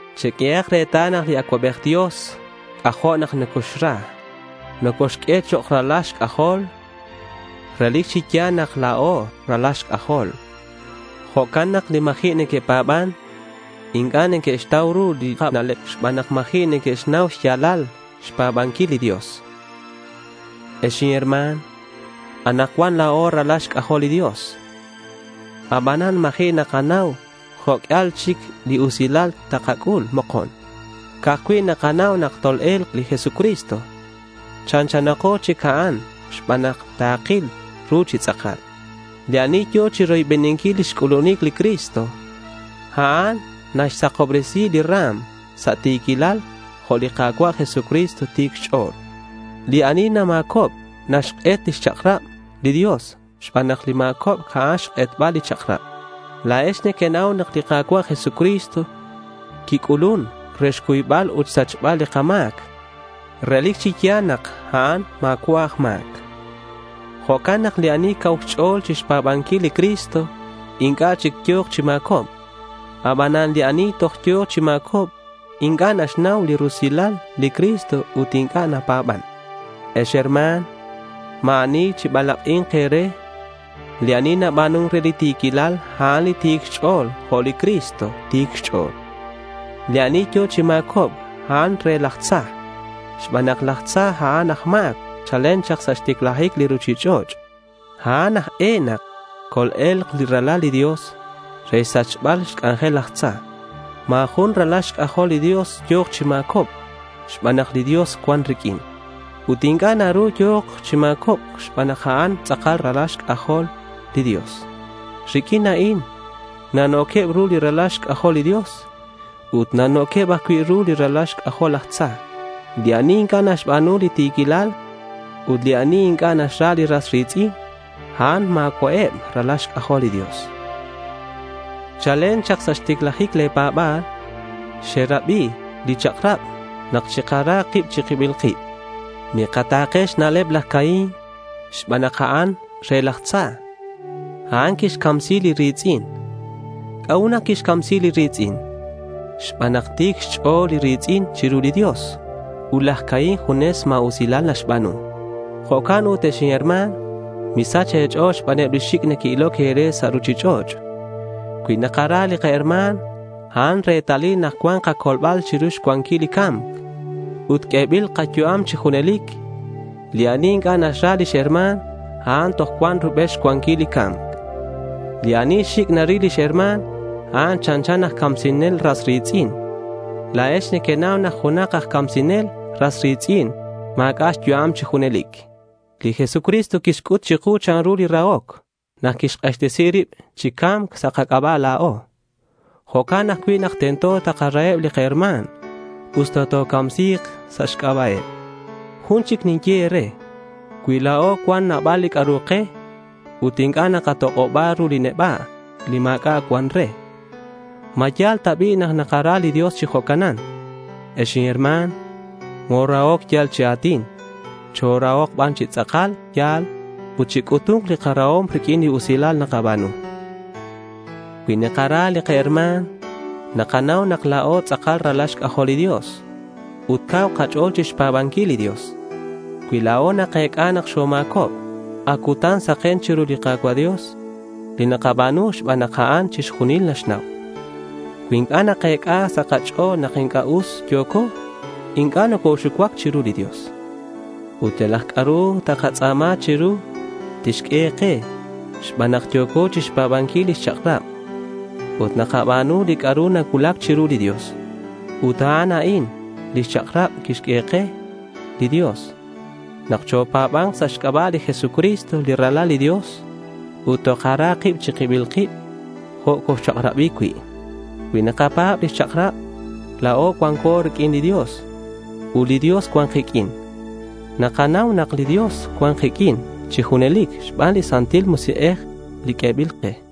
Cheq'uehak retal nak li Acuabej Dios c'ajo' nocoxra. Nocoxq'ue chok' ralal xc'ajol. Relic chi ya̱l nak la̱o ralal xc'ajol. Jo'can nak li ma̱ji' neque'pa̱ban inc'a' neque'xtau ru li kana'leb xban nak ma̱ji' neque'xnau xya̱lal xpa̱banquil li Dios. Ex inherma̱n, anakcuan la̱o ralal xc'ajol li Dios. Abanan ma̱ji' nakanau jo' q'uial chic li usilal takac'ul mokon. Ca'aj cui' nakanau nak tol-e̱lk li Jesucristo, chanchanako chic a'an xban nak takil ru chi tz'akal. Li ani yo̱ chiroybeninquil lix c'ulunic li Cristo, a'an naxsakobresi li ra̱m sa' ti̱quilal jo' li Ka̱cua' Jesucristo ti̱c xch'o̱l. Li ani nama̱cob naxk'et lix chak'rab li Dios xban nak li ma̱cobc a'an xk'etbal li chak'rab. La̱ex nequenau nak li Ka̱cua' Jesucristo quic'ulun re xcuybal ut xsachbal li kama̱c. Relic chi ya̱l nak a'an ma̱cua' aj ma̱c. Jo'can nak li ani cau xch'o̱l chixta̱kenquil li Cristo, inc'a' chic yo̱k chi ma̱cobc. Abanan li ani toj yo̱ chi ma̱cobc inc'a' naxnau li rusilal li Cristo ut inc'a' napa̱ban. Ex herma̱n, ma̱ ani chibalak'i̱nk e̱re. Li ani naba̱nun re li ti̱quilal, a'an ti̱c xch'o̱l jo' li Cristo ti̱c xch'o̱l. Li ani yo̱ chi ma̱cobc, a'an re laj tza xban nak laj tza a'an aj ma̱c chalen chak sa' xticlajic li ruchich'och'. A'an aj e nak col-e̱lk li Ralal li Dios re xsachbal xc'anjel laj tza. Ma̱ jun ralal xc'ajol li Dios yo̱k chi ma̱cobc xban nak li Dios cuan riq'uin. Ut inc'a' naru nak yo̱k chi ma̱cobc xban nak a'an tz'akal ralal xc'ajol li Dios. Riq'uin a'in na'no̱queb ru li ralal xc'ajol li Dios ut na'no̱queb ajcui' ruheb li ralal xc'ajol laj tza: li ani inc'a' naxba̱nu li ti̱quilal, ut li ani inc'a' naxra li ras ri̱tz'in, a'an ma̱cua'eb ralal xc'ajol li Dios. Chalen chak sa' xticlajic le̱ pa̱ba̱l xerabi li chak'rab nak chikarahak kib chi kibil kib. Mikata̱ke xna'leb laj Caín xban nak a'an re laj tza. A'an quixcamsi li ri̱tz'in. ¿C'a'ut nak quixcamsi li ri̱tz'in? Xban nak ti̱c xch'o̱l li ri̱tz'in chiru li Dios ut laj Caín junes ma̱usilal naxba̱nu. Jo'can ut ex inherma̱n, misach e̱ch'o̱l xbaneb li xic' neque'iloc e̱re sa' ruchich'och'. Cui nakara li kaherma̱n, a'an retalil nak cua̱nk kacolbal chiru xcuanquil li ca̱mc ut q'uebil kayu'am chi junelic. Li ani inc'a' naxra lix herma̱n, a'an toj cuan rubel xcuanquil li ca̱mc. Li ani xic' naril lix herma̱n, a'an chanchan aj camsinel ras ri̱tz'in. La̱ex nequenau nak junak aj camsinel ras ri̱tz'in ma̱c'a' xyu'am chi junelic. Li Jesucristo quixc'ut chiku chanru li rahoc nak quixk'axtesi rib chi ca̱mc sa' kac'aba' la̱o. Jo'can ajcui' nak tento takaraheb li kaherma̱n usta tocamsi̱k sa' xc'aba'eb. Jun chic ninye e̱re. Cui la̱o cuan nabal li c'a'ru ke ut inc'a' nakatok'oba ru li neba' li ma̱c'a' cuan re, ¿ma ya̱l ta bi' nak nakara li Dios chi jo'canan? Ex inherma̱n, morahoc yal chi a̱tin. Chorahok ban chi tz'akal ya̱l ut chic'utu̱nk li karahom riq'uin li usilal nakaba̱nu. Cui nakara li kaherma̱n, nakanau nak la̱o tz'akal ralal xc'ajol li Dios, ut cau kach'o̱l chixpa̱banquil li Dios. Cui la̱o nakec'a nak xoma̱cob, ac cutan saken chiru li Ka̱cua' Dios li nakaba̱nu xban nak a'an chixjunil naxnau. Cui inc'a' nakec'a sa' kach'o̱l nak inc'a' us yo̱co, inc'a' nocoxucuac chiru li Dios. Ut yalak c'a'ru takatz'a̱ma chiru, tixq'ue ke xban nak yo̱co chixpa̱banquil lix chak'rab ut nakaba̱nu li c'a'ru nacuulac chiru li Dios. Ut a'an a'in lix chak'rab quixq'ue ke li Dios, nak chopa̱ba̱nk sa' xc'aba' li Jesucristo li Ralal li Dios ut takara kib chi kibil kib, jo' coxchak'rabi cui'. Cui nakapa̱b lix chak'rab, la̱o cuanco riq'uin li Dios ut li Dios cuan kiq'uin. Nakanau nak li Dios cuan kiq'uin chi junelic xban li Santil Musik'ej li q'uebil ke.